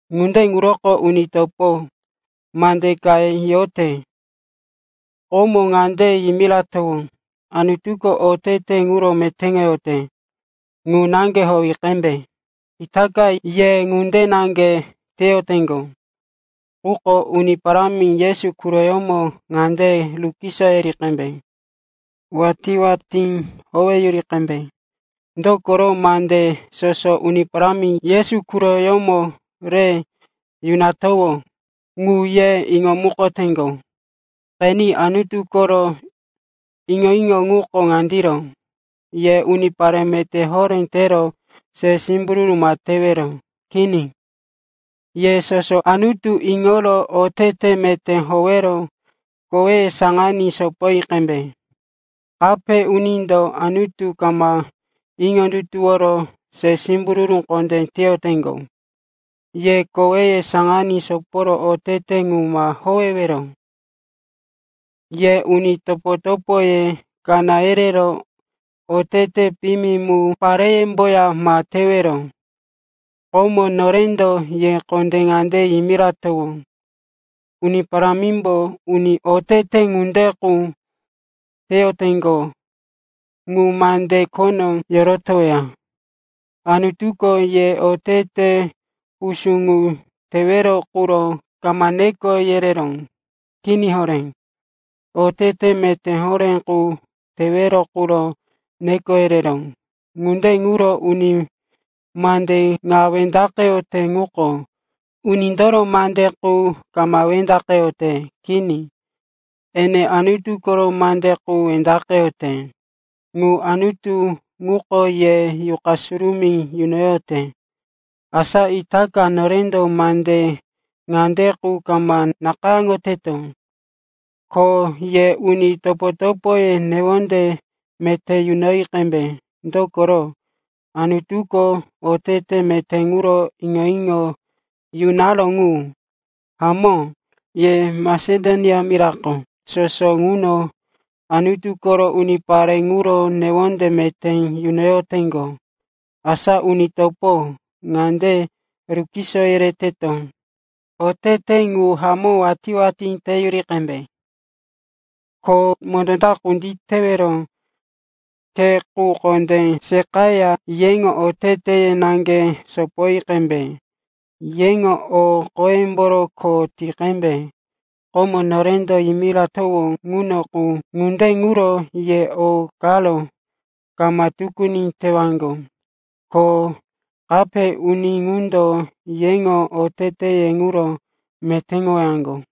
Ŋunde ŋuroko, uni topo, mande ka yote. Komo ŋande yimiratowó, Anutuko otete ŋuro metéŋoyote ŋu naŋge howi qembe. Itaka ye ŋunde naŋge teyoteŋgo, quko Uni Parámi Yesu quroyómo ŋande rukiso yereyoteto, watí-watí hamó howeyuri qembe. Dokoro mande soso Uni Parámi Yesu owímo re yunatowó ŋu ye iŋomukoteŋgo. Qeni, Anutu koro iŋo-iŋo ŋuko ŋandiro. Ye unipare meté horé tero se simbururu ma tewero. Kini, ye soso Anutu iŋoro otete meté howero koweye saŋaní sopoyi qembe. Kape unindo Anutu kama iŋondutuworo se simbururu kondé teyoteŋgo. Ye koweye saŋaní soporo otete ŋu ma howewero. Ye uni topo-topoye kaná yerero otete piyimi mu pareyemboya ma tewero. Komo norendo ye kondé ŋande yimiratowó. Uni Parámimbo uni otete ŋunde qu teyoteŋgo ŋu mande khono yorotoweya. Anutuko ye otete pusú ŋu tewero quro kama neko yereró. Kini horé. Otete meté horé qu tewero quro neko yereró. Ŋunde ŋuro uni mande ŋa wendaqeyote ŋuko unindoro mande qu kama wendaqeyote. Kini, ene Anutu koro mande qu wendaqeyote, ŋu Anutu ŋuko ye Yuqa Surumí yunoyote. Asa itaka norendo mande ŋande qu kama nakayáŋowato, ko ye uni topo-topoye newonde meté yunoyi qembe. Dokoro, Anutuko otete meté ŋuro iŋo-iŋo yunaró ŋu. Hamó, ye Masedonia mira soso ŋuno Anutu koro unipare ŋuro newonde meté yunoyoteŋgo. Asa uni topo, ŋande rukiso yereteto, otete ŋu hamó watí-watí teyuri qembe. Ko mondó ta kunditewero khe qu kondé seqaya yeŋo oteteye naŋge sopoyi qembe. Yeŋo o qoyemboro kho ti qembe, komo norendo yimiratowó ŋuno qu. Ŋunde ŋuro ye o karo kama tukuni tewaŋgo, ko kape uni ŋundo yeŋo oteteye ŋuro metéŋowaŋgo.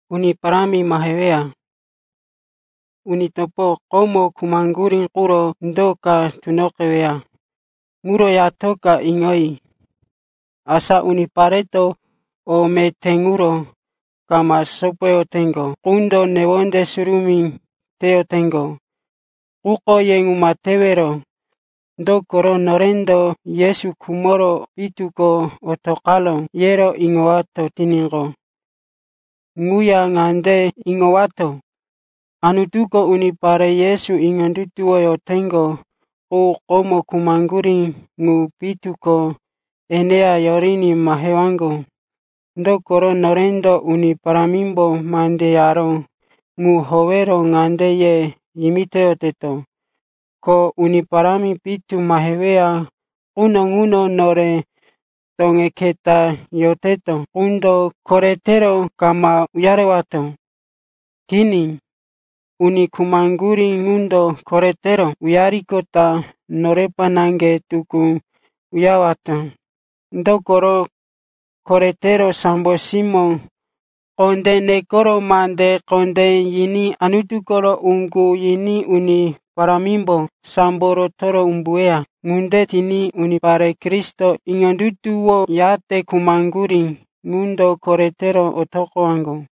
Uni topo, uni topo komo khumaŋgurí quro do ka tunoqeweya ŋuro yatoka iŋoyi. Asa unipareto o meté ŋuro kama sopoyoteŋgo qundo newonde surumí teyoteŋgo. Quko ye ŋu ma tewero. Dokoro norendo, Yesu khumoro pitu ko otoqaró, yero iŋowato tiníqo, ŋuya ŋande iŋowato, Anutuko unipare Yesu iŋondutuwoyoteŋgo qu komo khumaŋgurí ŋu pitu ko eneya yoriní mahewaŋgo. Dokoro norendo Uni Parámimbo mande yaró ŋu howero ŋande ye yimitoyoteto, ko Uni Parámi pitu maheweya quno ŋuno nore toŋe keta yoroteto qundo koretero kama uyarewato. Kini, uni khumaŋgurí ŋundo koretero uyariqota norepa naŋge tukú uyarewato. Dokoro koretero sambo simó kondé nekero mande kondé yiní Anutu koro uŋgu yiní Uni Parámimbo sambo rotoro umbuweya. Ŋunde tiní unipare Kristo iŋondutuwoyate khumaŋgurí ŋundo koretero otoqowaŋgo.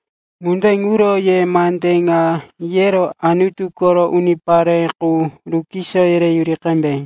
Ŋunde ŋuro ye mande ŋa yero Anutu koro unipare qu rukiso yereyuri qembe.